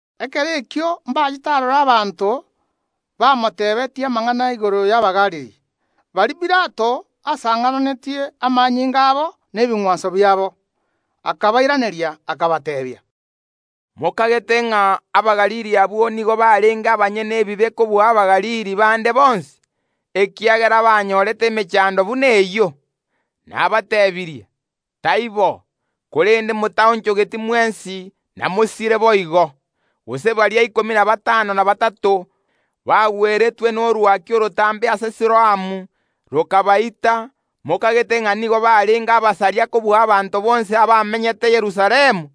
Ekero ekio mbachete aroro abanto bamotebetie amang’ana igoro y’Abagalili, baria Pilato asang’ananetie amanyinga abo nebing’wanso biabo. Akabairaneria, akabateebia, “Mokagete ng’a Abagalili abwo nigo barenge abanyene ebibe kobua Abagalili bande bonsi, ekiagera banyorete emechando buna eyio? Nabatebirie, taibo; korende motaonchogeti mwensi namosire boigo. Gose baria ikomi na batano na batato bagweretwe norwaki orotambe ase Siloamu, rokabaita, mokagete ng’a nigo barenge abasaria kobua abanto bonsi abamenyete Yerusalemu?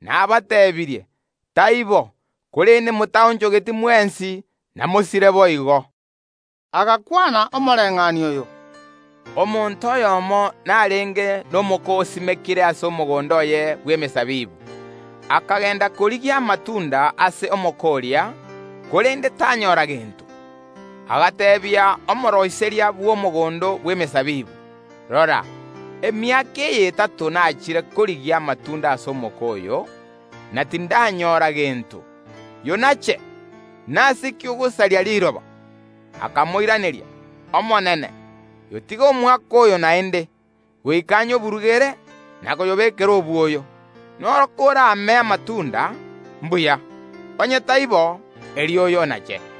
Nabatebirie, taibo; korende motaonchogeti mwensi, namosire boigo.” Agakwana omoreng’anio oyo, “Omonto oyomo narenge nomoko osimekire ase omogondo oye bw’emesabibu; akagenda korigia amatunda ase omoko oria, korende tanyora gento. Agateebia omooroiseria bw’omogondo bw’emesabibu: Rora, emiaka eye etato nachire korigia amatunda ase omoko oyo, na tindanyora gento. Yonache! Nase ki ogosaria riroba? Akamoiraneria: Omonene, yotige omwaka oyo naende, goika nyoburugere na koyobekera obwoyo. Noro korame amatunda, mbuya; onye taibo, erio oyonache.”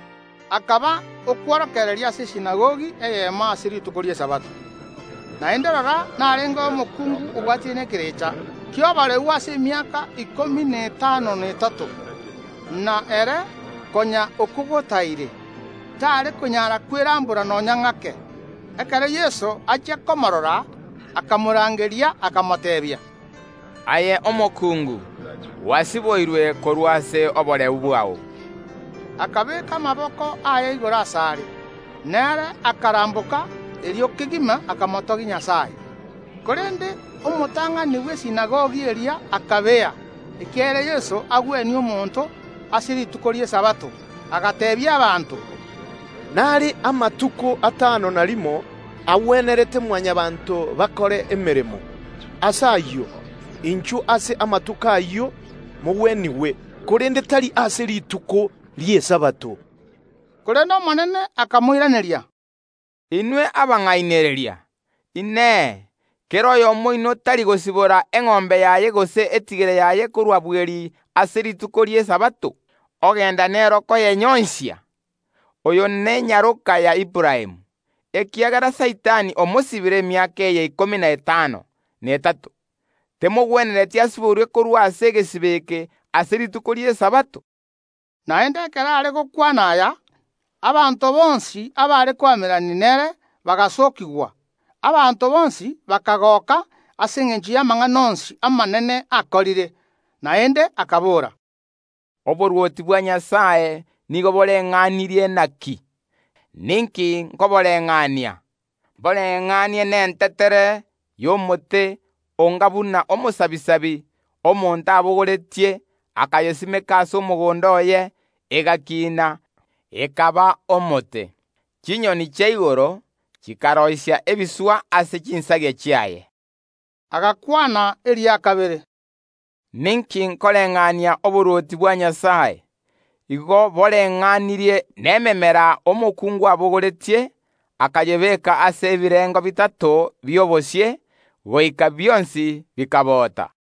Akaba okworokereria ase esinagogi eyemo ase rituko ri’Esabato. Naende rora, narengeo omokungu obwatire nekerecha ki’oboreu ase emiaka ikomi na etano na etato, na ere konya okogotaire, taare konyara kwerambora nonya ng’ake. Ekero Yeso achia komoorora, akamorangeria, akamoteebia, “Aye omokungu, gwasiboirwe korwa ase oboreu bwao.” Akabeka amaboko aye igoro asare, na ere akaramboka erio kegima, akamotogia Nyasae. Korende omotang’ani bw’esinagogi eria akabea, ekiagera Yeso agwenia omonto ase rituko ri’Esabato, agateebia abanto, “Nare amatuko atano na rimo agwenerete Mwanyabaanto bakore emeremo; ase ayio, inchwo ase amatuko ayio mogwenigwe, korende tari ase rituko ri’Esabato.” Korende Omonene akamoiraneria, “Inwe abang’ainereria, Inee, kera oyomo oino tari gosibora eng’ombe yaye gose etigere yaye korwa bweri ase rituko ri’Esabato, ogenda nero koyenyoisia? Oyo nenyaroka ya Aburaamu; ekiagera Saitani omosibire emiaka eye ikomi na etano na etato, temogwenereti asiborwe korwa ase egesibo eke ase rituko ri’Esabato?” Naende ekero are gokwana aya, abanto bonsi abare koamererania nere bagasookigwa. Abanto bonsi bakagoka ase engencho y’amang’ana onsi amanene akorire. Naende akabora, “Oborwoti bwa Nyasae nigo boreng’anirie naki? Ninki nkoboreng’ania? Mboreng’anie nentetere y’omote onga buna omosabisabi omonto abogoretie, akayesimeka ase omogondo oye; egakina, ekaba omote. Chinyoni chia igoro chikaroisia ebiswa ase chinsagia chiaye.” Agakwana eria kabere, “Ninki nkoreng’ania oborwoti bwa Nyasae? Igo boreng’anirie nememera omokungu abogoretie, akayebeka ase ebirengo bitato bi’obosie, goika bionsi bikabota.”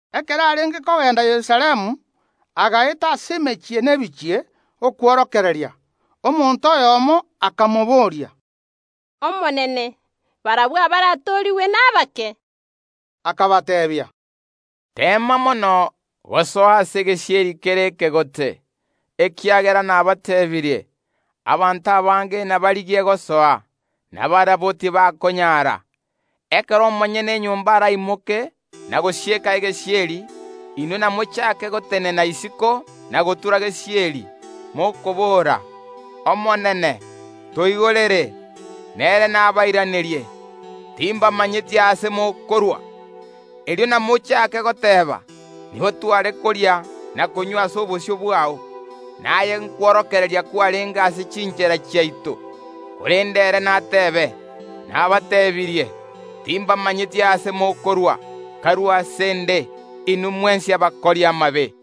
Ekero arenge kogenda Yerusalemu, agaeta ase emechie na ebichie okworokereria. Omonto oyomo akamobooria, “Omonene, barabwo abaratoorigwe nabake?” Akabateebia, “Teema mono gosoa ase egesieri kere ekegote, ekiagera nabateebirie: Abanto abange nabarigie gosoa, na barabwo tibakonyara. Ekero omonyene enyomba araimoke na gosieka egesieri, inwe namochake gotenena isiko na gotura gesieri, mokobora, Omonene, toigorere, na ere nabairanerie: Timbamanyeti aase mokorwa. Erio namochake goteeba: Nigo tware koria na konywa ase obosio bwao, naye nkworokereria kwarenge ase chinchera chiaito. Korende ere natebe: Nabatebirie, timbamanyeti aase mokorwa; karue ase ’nde, inwe mwensi abakori amabe.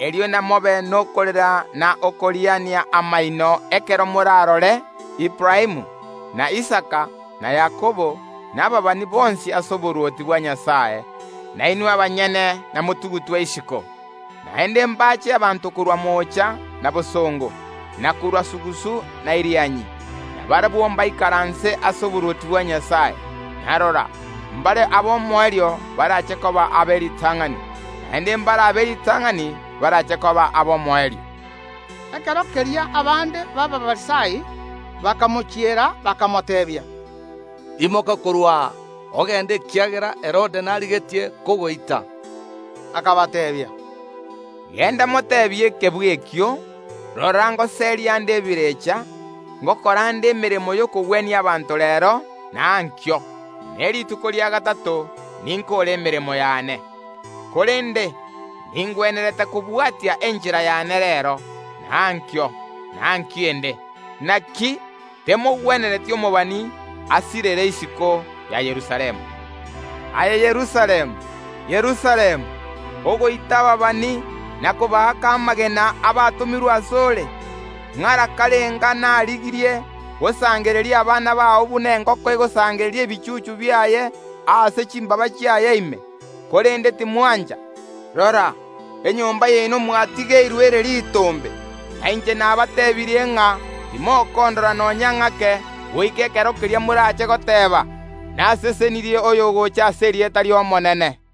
Erio namobe nokorera na okoriania amaino, ekero morarore Aburaamu, na Isaka, na Yakobo, na ababani bonsi ase oborwoti bwa Nyasae, na inwe abanyene namotugutwe isiko. Naende mbache abanto korwa moocha na bosongo, na korwa sugusu na Irianyi, na barabwo mbaikaranse ase oborwoti bwa Nyasae. Na rora, mbare ab’omoerio barache koba ab’eritang’ani, naende mbare ab’eritang’ani barache koba ab’omoerio.” Ekero keria abande b’Abafarisai bakamochiera, bakamoteebia, “Imoka korwa aa, ogende, ekiagera Herode narigetie kogoita.” Akabateebia, “Genda moteebie ekebwe ekio: Rora ngoseria nde ebirecha, ngokora nde emeremo y’okogwenia abanto reero na ankio, ne rituko ria gatato ninkoore emeremo yane. Korende ningwenerete kobwatia enchera yane reero, na ankio, na ankio ende, naki temogwenereti omobani asirere isiko ya Yerusalemu. “Aye Yerusalemu, Yerusalemu, ogoita ababani na kobaaka amagena abatomirwe ase ore! Ng’ara karenga narigirie gosangereria abana bao buna engoko egosangereria ebichuchu biaye aase chimbaaba chiaye ime, korende timwancha! Rora, enyomba yaino mwatigeirwe ere ritombe; na inche nabateebirie ng’a timokondora nonya ng’ake, goika ekero keria morache goteeba: Nasesenirie oyogocha ase erieta ri ’Omonene.”